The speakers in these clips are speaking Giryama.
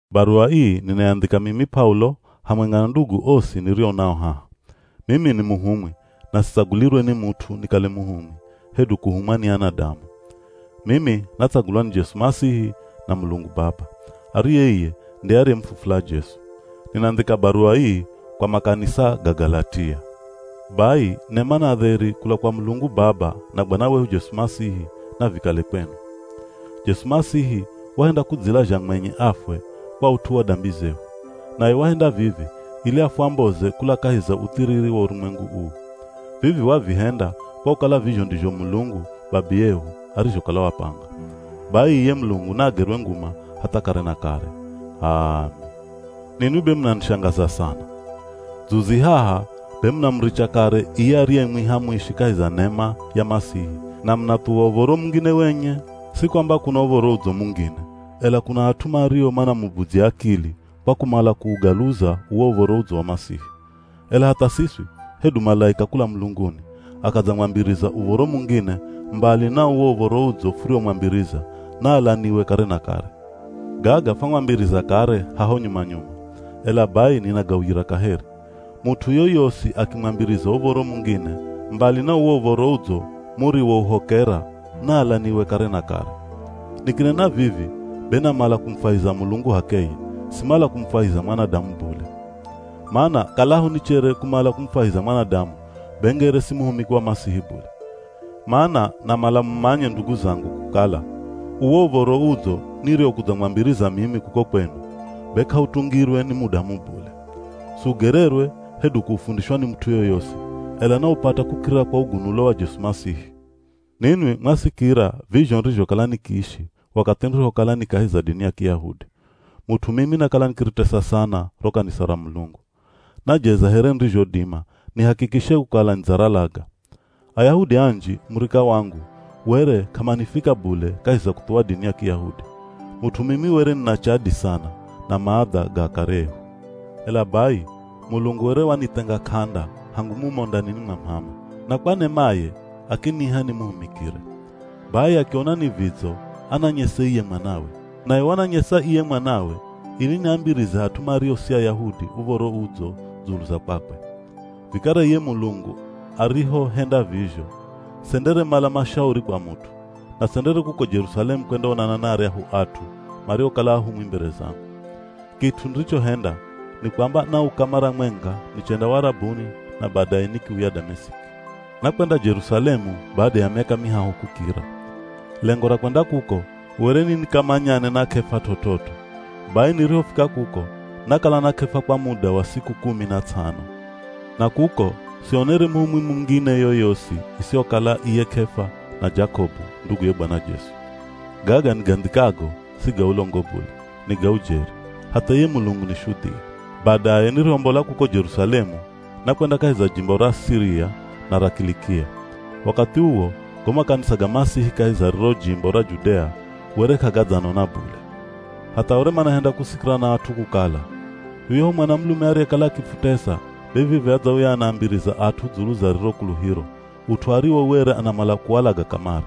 Baruwa ii ninayandhika mimi P'aulo, hamwenga na ndugu osi nirio nao haha. Mimi ni muhumwi, na sitsagulirwe ni mut'u nikale muhumwi hedu kuhumwa ni anadamu. Mimi natsagulwa ni Jesu Masihi na Mulungu Baba, ariye iye nde ariyemufufula Jesu. Ninandhika baruwa ii kwa makanisa ga Galatia. Bai nema na dheri kula kwa Mulungu Baba na Bwana wehu Jesu Masihi, navikale kwenu. Jesu Masihi wahenda kudzilazha mwenye afwe kwa ut'u wa dambi zehu. Naye wahenda vivi ili afwamboze kula kahi za uthiriri wa urumwengu uu. Vivi wavihenda kwa kukala vizho ndizho Mulungu, Babiyehu arizhokala wapanga. Bai iye Mulungu naagerwe nguma hatha kare na kare! H'aami. Ninwi be munanishangaza sana! Dzuzi haha be munamuricha kare iye ariyemwiha muishi kahi za nema ya Masihi, na munathuwa uv̱oro mungine wenye. Si kwamba kuna Uv̱oro Udzo mungine, ela kuna at'u mario manamubudzya akili kwa kumala kuugaluza uwo Uv̱oro Udzo wa Masihi. Ela hatha siswi, hedu malaika kula mulunguni, akadzamwambiriza uv̱oro mungine mbali na uwo Uv̱oro Udzo furiomwambiriza, naalaniwe kare na kare. Gaga fwamwambiriza kare haho nyuma-nyuma, ela bai ninagauyira kaheri. Mut'u yoyosi akimwambiriza uv̱oro mungine mbali na uwo Uv̱oro Udzo muriwouhokera, naalaniwe kare na kare. Nikinena vivi, be namala kumufwahiza Mulungu h'akeye, simala kumufwahiza mwanadamu bule. Mana kalaho nichere kumala kumufwahiza mwanadamu, be ngere si muhumiki wa Masihi bule. Mana namala mumanye ndugu zangu kukala, uwo Uv̱oro Udzo niriokudzamwambiriza mimi kuko kwenu, be k'autungirwe ni mudamu bule. Siugererwe, hedu kuufundishwa ni mut'u yoyosi, ela naupata kukirira kwa ugunulo wa Jesu Masihi. Ninwi mwasikira vizho nirizhokala nikiishi wakathi nirihokala ni kahi za dini ya Kiyahudi. Mut'u mimi nakala nikiritesa sana ro kanisa ra Mulungu. Najeza here nirizhodima nihakikishe kukala nidzaralaga. Ayahudi anji, murika wangu were k'amanifika bule kahi za kuthuwa dini ya Kiyahudi. Mut'u mimi were nina chadi sana na maadha ga akare ehu. Ela bai Mulungu were wanithenga k'anda hangu mumo ndanini mwa m'ama, na kwa nemaye akiniha nimuhumikire. Bai akiona ni vidzo ananyese iye Mwanawe. Naye wananyesa iye Mwanawe ili niambirize at'u mario si Ayahudi Uv̱oro Udzo dzulu za kwakwe. Vikara iye Mulungu arihohenda vizho, senderemala mashauri kwa mut'u, na sendere kuko Jerusalemu kwendaonana na aryahu at'u mariokala ahumwi mbere zangu. Kit'u nirichohenda, ni kwamba nauka mara mwenga nichenda Warabuni na badaye nikiuya Damesiki. Nakwenda Jerusalemu bada ya miaka mihahu kukira. Lengo ra kwenda kuko were ni nikamanyane na K'efa t'ot'ot'o. Bai nirihofika kuko, nakala na K'efa kwa muda wa siku kumi na ts'ano. Na kuko sionere muhumwi mungine yoyosi isihokala iye K'efa na Jakobu, nduguye Bwana Jesu. Gaga nigandhikago si ga ulongo bule, ni ga ujeri, hatha iye Mulungu ni shudhia. Badaye nirihombola kuko Jerusalemu nakwenda kahi za jimbo ra Siria na ra Kilikia. Wakathi uwo, go makanisa ga Masihi kahi za riro jimbo ra Judea, were k'agadzanona bule. Hatha were manahenda kusikira na at'u kukala, “Yuyahu mwanamulume ariyekala akifutesa, be vivi adzauya anaambiriza at'u dzulu za riro kuluhiro, ut'u ariwo were anamala kuwalaga kamare.”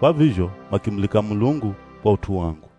Kwa vizho makimulika Mulungu kwa ut'u wangu.